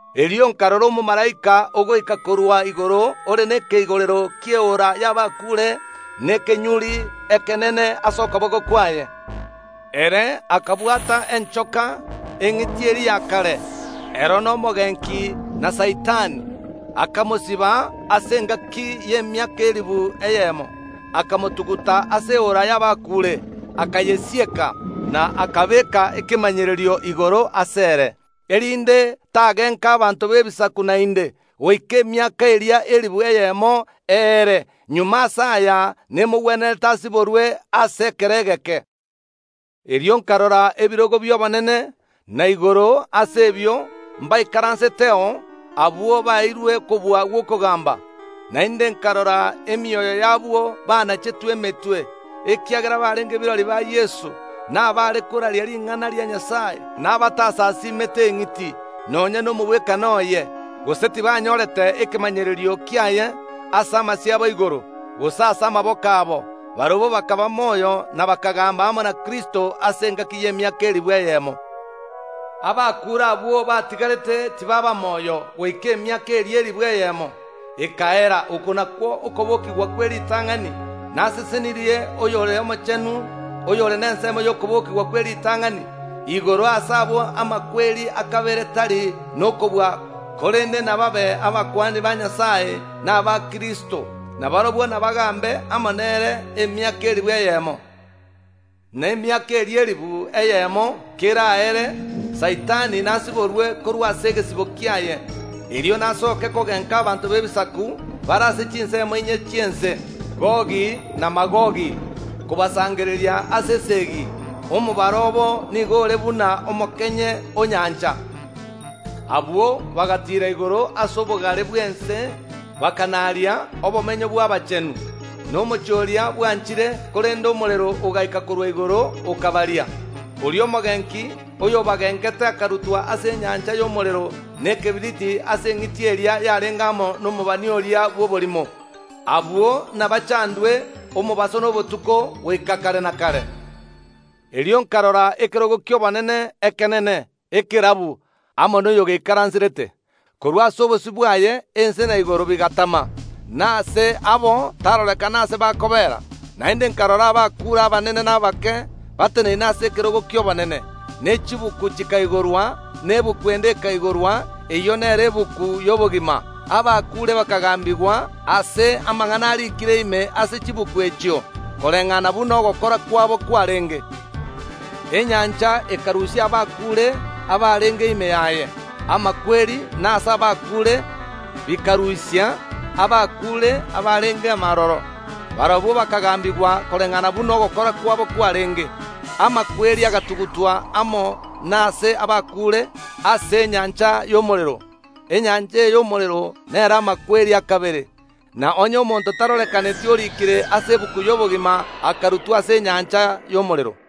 Erio nkarora omomalaika ogoika korwa igoro ore nekeigorero ki’eora y’abakuure na ekenyuri ekenene ase okoboko kwaye. Ere akabwata enchoka, eng’iti eria ya kare, ero n’Omogenki na Saitani, akamosiba ase engaki y’emiaka elifu eyemo, akamotuguta ase eora y’abakuure, akayesieka, na akabeeka ekemanyererio igoro asere, erinde tagenka abanto b’ebisaku naende, goika emiaka eria elifu eyemo eere. Magega ase aya nemogwenerete asiborwe ase ekero egeke. Erio nkarora ebirogo bi’obonene, na igoro ase ebio mbaikaranseteo abwo baeirwe okobua gw’okogamba. Naende nkarora emioyo y’abwo banachetwe emetwe ekiagera barenge birori ba Yeso, na baare koraria ring’ana ria Nyasae, na batasasiimete eng’iti, nonya nomogwekano oye, gose tibanyorete ekemanyererio kiaye ase amasio abo igoro, gose ase amaboko abo. Barabwo bakaba moyo na bakagamba amo na Kristo ase engaki y’emiaka elifu eyemo. Abakuure abwo batigarete tibaaba moyo goika emiaka eria elifu eyemo, ekaera. Okwo nakwo okobokigwa kw’eritang’ani. Nasesenirie oyore omochenu, oyore nensemo y’okobokigwa kw’eritang’ani. Igoro ase abwo amakweri a kabere tari nokobua korende nababe abakuani ba Nyasae na abakristo, na barabwo nabagambe amo nere emiaka elifu eyemo. Na emiaka eria elifu eyemo keraere, Saitani nasiborwe korwa ase egesibo kiaye. Erio nasooke kogenka abanto b’ebisaku bare ase chinsemo inye chi’ense, Gogi na Magogi, kobasangereria ase esegi. Omobaro obo nigo ore buna omokenye o nyancha. Abwo bagatiira igoro ase obogare bw’ense, bakanaaria obomenyo bw’abachenu, na omochie oria bwanchire, korende omorero ogaika korwa igoro, okabaria. Oria Saitani, oyobagengete, akarutwa ase enyancha y’omorero na ekebiriti aase eng’iti eria yarenge amo nomobani oria bw’oborimo. Abwo nabachandwe omobaso na obotuko goika kare na kare. Erio nkarora ekerogo ki’obonene, ekenene, ekerabu, amo noyogeikaranserete. Korwa ase obosio bwaye ense na igoro bigatama, na aase abo tarorekana ase bakobeera. Naende nkarora abakuure, abanene na abake, bateneneine ase ekerogo ki’obonene, ne chibuku chikaigorwa. Na egetabu ende ekaigorwa, eyio nero egetabu y’obogima. Abakuure bakagambigwa ase amang’ana ariikire ime ase chibuku echio koreng’ana buna ogokora kwabo kwarenge. Enyancha ekarusia abakuure abarenge ime yaye. Amakweri na aase abakuure bikarusia abakuure abarenge ime aroro. Barabwo bakagambigwa koreng’ana buna ogokora kwabo kwarenge. Amakweri agatugutwa amo na aase abakuure ase enyancha y’omorero. Enyancha eye y’omorero nero amakweri a kabere. Na onye omonto tarorekaneti orikire ase egetabu y’obogima akarutwa ase enyancha y’omorero.